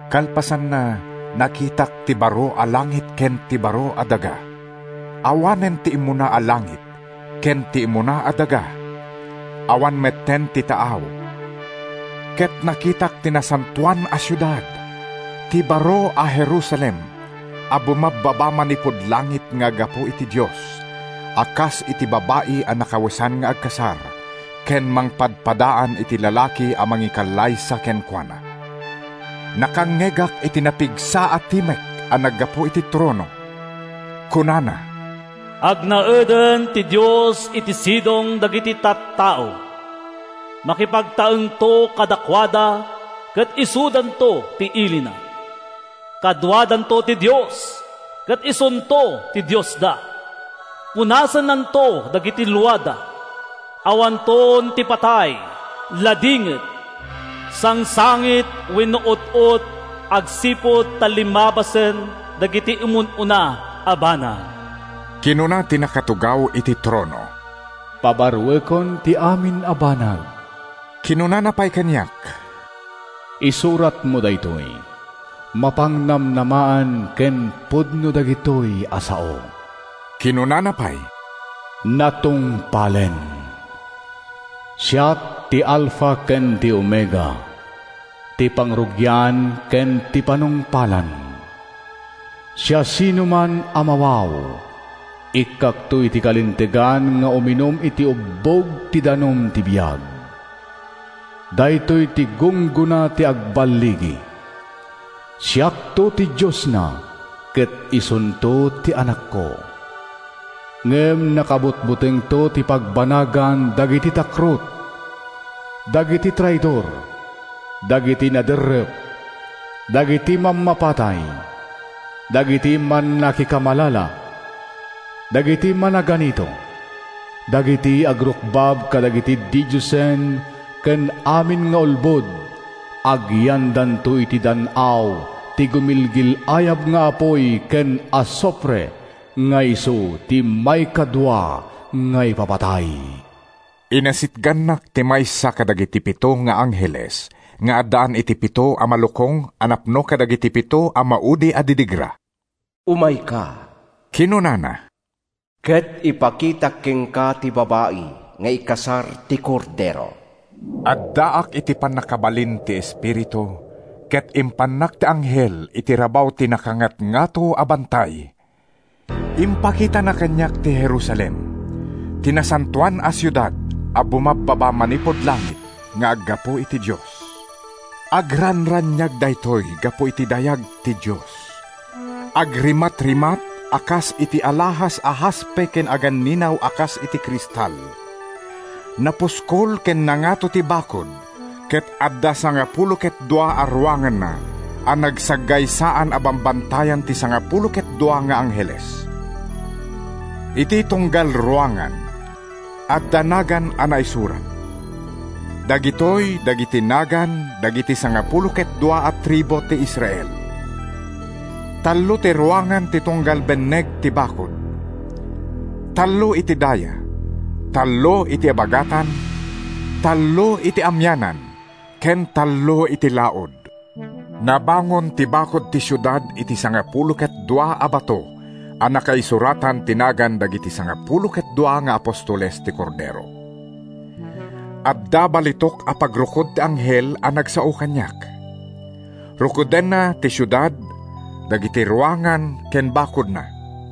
Kalpasanna, nakitak ti baro a langit ken ti baro a daga. Awanen ti immuna a langit ken ti immuna a daga. Awan metten ti taaw. Ket nakitak ti Nasantoan a Siudad, ti baro a Jerusalem, a bumabbaba manipud langit nga aggapu iti Dios, a kas iti babai a nakawesan nga agkasar ken mangpadpadaan iti lalaki a mangikallaysa kenkuana. Nakangngegak iti napigsa a timek a naggapu iti trono. Kunana: “Agnaeden ti Dios iti sidong dagiti tattao! Makipagtaengto kadakuada ket isudanto ti ilina. Kaduadanto ti Dios, ket isunto ti Diosda. Punasennanto dagiti luada. Awanton ti patay, ladingit, sangsangit wenno ut-ot agsipud ta limmabasen dagiti immun-una a banag.” Kinuna ti nakatugaw iti trono, “Pabaroekon ti amin a banag!” Kinunana pay kaniak, “Isuratmo daytoy: Mapangnamnamaan ken pudno dagitoy a sao.” Kinunana pay, “Natungpalen! Siak ti Alfa ken ti Omega, ti pangrugian ken ti panungpalan. Siasinoman a mawaw, ikkakto iti kalintegan nga uminum iti ubbog ti danum ti biag. Daytoy ti gunggona ti agballigi: Siakto ti Diosna ket isunto ti anakko. Ngem nakabutbutengto ti pagbanagan dagiti takrot, dagiti traidor, dagiti naderrep, dagiti mammapatay, dagiti mannakikamalala, dagiti managanito, dagiti agrukbab kadagiti didiosen ken amin nga ulbod—agyandanto iti dan-aw ti gumilgil-ayab nga apuy ken asufre nga isu ti maikadua nga ipapatay.” Inasitgannak ti maysa kadagiti pito nga angheles nga addaan iti pito a malukong a napno kadagiti pito a maudi a didigra. “Umayka,” kinunana, “ket ipakitak kenka ti babai nga ikasar ti Kordero.” Addaak iti pannakabalin ti Espiritu ket impannak ti anghel iti rabaw ti nakangatngato a bantay. Impakitana kaniak ti Jerusalem, ti Nasantoan a Siudad a bumabbaba manipud langit nga aggapu iti Dios. Agranraniag daytoy gapu iti dayag ti Dios. Agrimatrimat a kas iti alahas a haspe ken aganninaw a kas iti kristal. Napuskol ken nangato ti bakud ket adda sangapulo ket dua a ruanganna a nagsaggaysaan a bambantayan ti sangapulo ket dua nga angheles. Iti tunggal ruangan, adda nagan a naisurat. Dagitoy dagiti nagan dagiti sangapulo ket dua a tribu ti Israel. Tallo ti ruangan ti tunggal benneg ti bakud: tallo iti daya, tallo iti abagatan, tallo iti amianan ken tallo iti laud. Nabangon ti bakud ti siudad iti sangapulo ket dua a bato a nakaisuratan ti nagan dagiti sangapulo ket dua nga apostoles ti Kordero. Adda balitok a pagrukod ti anghel a nagsao kaniak. Rukodenna ti siudad, dagiti ruangan ken bakudna.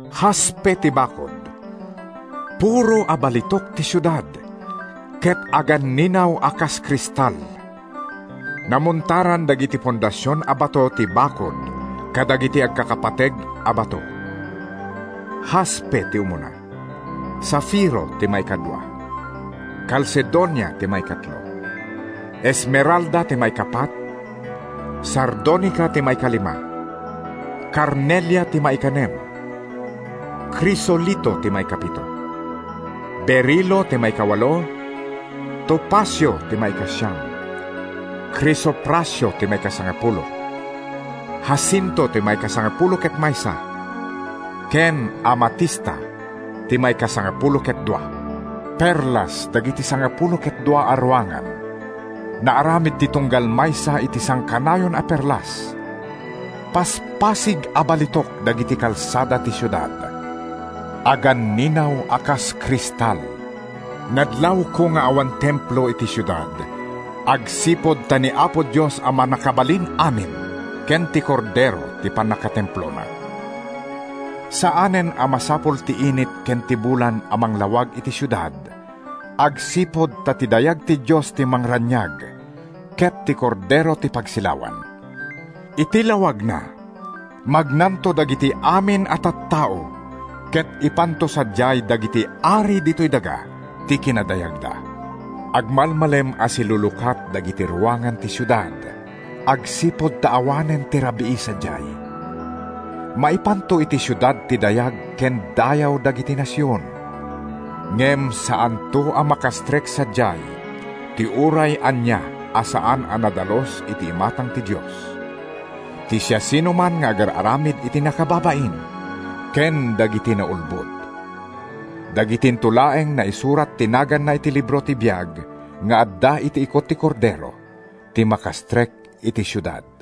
Haspe ti bakud, puro a balitok ti siudad, ket aganninaw a kas kristal. Namontaran dagiti fondasion a bato ti bakud kadagiti agkakapateg a bato. Haspe ti umuna; safiro ti maikadua; kalsedonia ti maikatlo; esmeralda ti maikapat; sardonika ti maikalima; karnelia ti maikanem; krisolito ti maikapito; berilo ti maikawalo; topasio ti maikasiam; krisoprasio ti maikasangapulo; hasinto ti maikasangapulo ket maysa ken amatista ti maikasangapulo ket dua. Perlas dagiti sangapulo ket dua a ruangan; naaramid ti tunggal maysa iti sangkanayon a perlas. Paspasig a balitok dagiti kalsada ti siudad; aganninaw a kas kristal. Nadlawko nga awan templo iti siudad agsipud ta ni Apo Dios a Mannakabalin-amin ken ti Kordero ti pannakatemplona. Saanen a masapul ti init ken ti bulan a manglawag iti siudad agsipud ta ti dayag ti Dios ti mangranraniag ket ti Kordero ti pagsilawan. Iti lawagna, magnanto dagiti amin a tattao ket ipanto sadiay dagiti ari ditoy daga ti kinadayagda. Agmalmalem a silulukat dagiti ruangan ti siudad agsipud ta awanen ti rabii sadiay. Maipanto iti siudad ti dayag ken dayaw dagiti nasion. Ngem saanto a makastrek sadiay ti uray ania a saan a nadalus iti imatang ti Dios, ti siasinoman nga agar-aramid iti nakababain ken dagiti naulbod. Dagitinto laeng naisurat ti naganna iti libro ti biag nga adda iti ikut ti Kordero ti makastrek iti siudad.